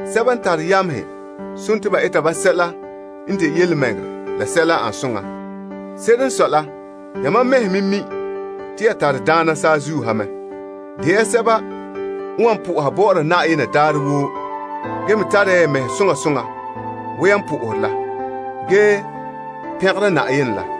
Sɛba n tare yamehe, eta ba sɛla n de yelemɛŋɛrɛ la sɛla n ane soŋa. Se'ere n sɔe la, yamam mɛhe me mi' te ya tare daana saazuo ha mɛ. De ya sɛba n wan sohore ya Yenɛ daarɛ woo ge me tare ya ya mɛhe soŋa soŋa wo yan sohore la, ge pɛngera Yenɛ la.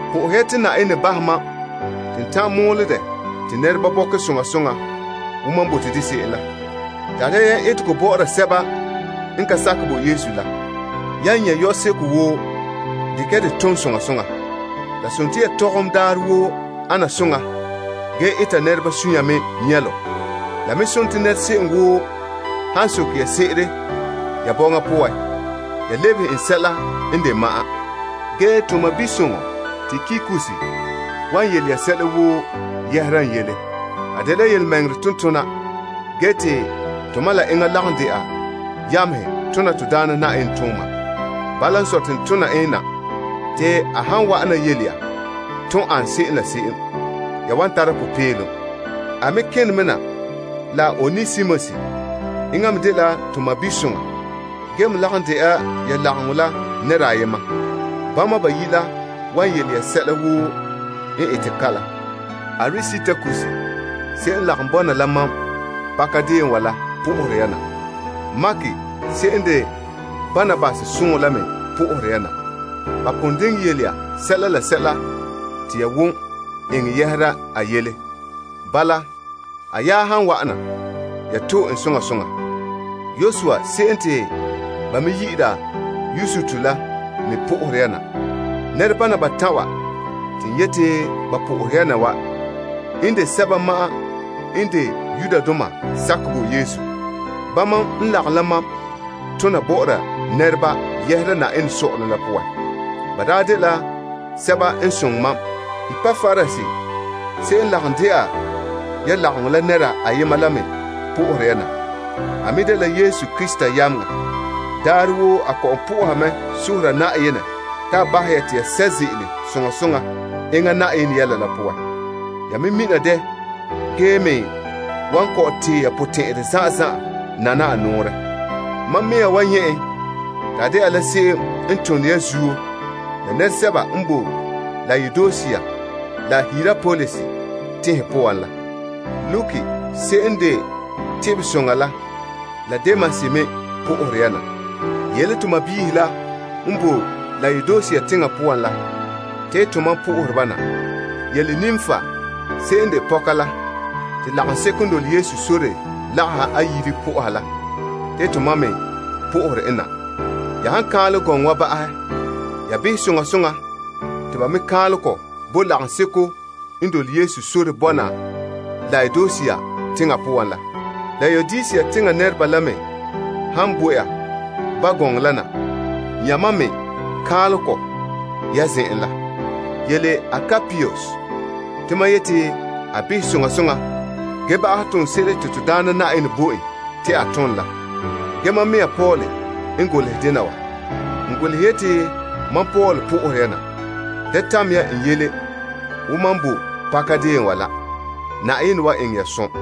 sohɛ ya te Yenɛ bahɛ mam te n ta'an mɔɔlɛ dɛ te nɛreba bɔkɛ soŋa soŋa wo mam bote de se'em la. Tare ya yam etegɔ eta bɔ'ɔra sɛba n ka sakɛ bo Yesu la. Yan nyɛ' yɔseko woo, dekɛ ya de tom soŋa soŋa. Ya yetɔgom daarɛ woo ana soŋa ge eta nɛreba suunre me nyɛlom. La se'em woo han soke ya se'ere ya bɔŋa poan, ya lebehe en sɛla n de ma'an. Ge to sɔɔnsoŋa Tikikus wan yele ya sɛla woo yɛhera n yele. A dela tontona n de birikina ge te tomam la enŋa lagom dɛna yamehe tona Na'ayenɛ tooma. Bala n sɔe te n tona en na te a han wa'ana yele ya ton an se'em la se'em, ya wan tara popeelom. A me kene me na la Onesimus. Enŋa me dela to sɔɔnsoŋa ge me lagom dɛna ya lagom la nɛra ayema. Bama bayi' la wan yele ya sɛla woo n ete kalom. Aristarkus se'em n lagom bɔna la mam pakadeen wa la po'ohere ya na. Mark se'em n de Barnabas sɔɔn la me po'ohere ya na. Ba pon yele ya sɛla te ya wan eŋɛ yɛhera a yele. Bala, a nya han wa'ana, ya to'e en soŋa soŋa. Yosua se'em te ba me yi'ira Yustus la me po'ohere ya na. Nɛrebana batan' wa te n yete ba po'ohere ya na wa n de sɛba ma'an n de Yudoma sakɛ bo Yesu. Bama n lagom la mam tona bɔ'ɔra nɛreba yɛhera Yenɛ sɔ'ɔlom la poan. Ba daa dela sɛba n soŋɛ mam. Epapras se'em n lagom dɛna ya lagom la nɛra ayema la me po'ohere ya na. A me dela Yesu Krista yameŋa. Daarɛ woo a kɔ'ɔn po'oha mɛ sohora Yenɛ te a bahɛ ya te ya sɛ' ze'ele soŋa soŋa enŋa Yenɛ yɛla la poan. Ya me mina dɛ ge me wan kɔ'ɔn tee ya potɛn'ɛra zan'an zan'an nana a nɔɔrɛ. Mam mɛŋa wa nyɛ' en te a dɛna la se'em n tone ya zuo la nɛresɛba n boe Laodisea la Hierapolis teŋhe poan la. Luke se'em n de teba soŋa la la Demas me po'ohere ya na. Yele to sɔɔnrɔ la n boe Laodisea teŋa poan la te tomam po'ohere ba na. Yele Nimpa se'em n de pɔka la te lagaŋseko n dole Yesu sore lagaha a yire po'oha la te to me po'ohere en na. Ya han kaanlɛ gɔŋɔ wa ba'ahɛ, ya behɛ soŋa soŋa te ba me kaanlɛ kɔ bo lagaŋseko n me dole Yesu sore bɔna Laodisea teŋa poan la. Laodisea teŋa nɛreba la me han bo ya ba gɔŋɔ la na, ya mam me kaanlɛ kɔ ya zen'en la. Yele Arkipus te mam yete a behɛ soŋa soŋa ge ba'ahɛ toonse'ere te Na'ayenɛ bo en te a tom la. Ge mam mɛŋa Paul n golehɛ dena wa: N golehɛ yeti mam Paul po'ohere ya na. Da tamɛ ya n yele wo mam boe pakadeen wa la. Zo'ohogɔ bɔna la ya.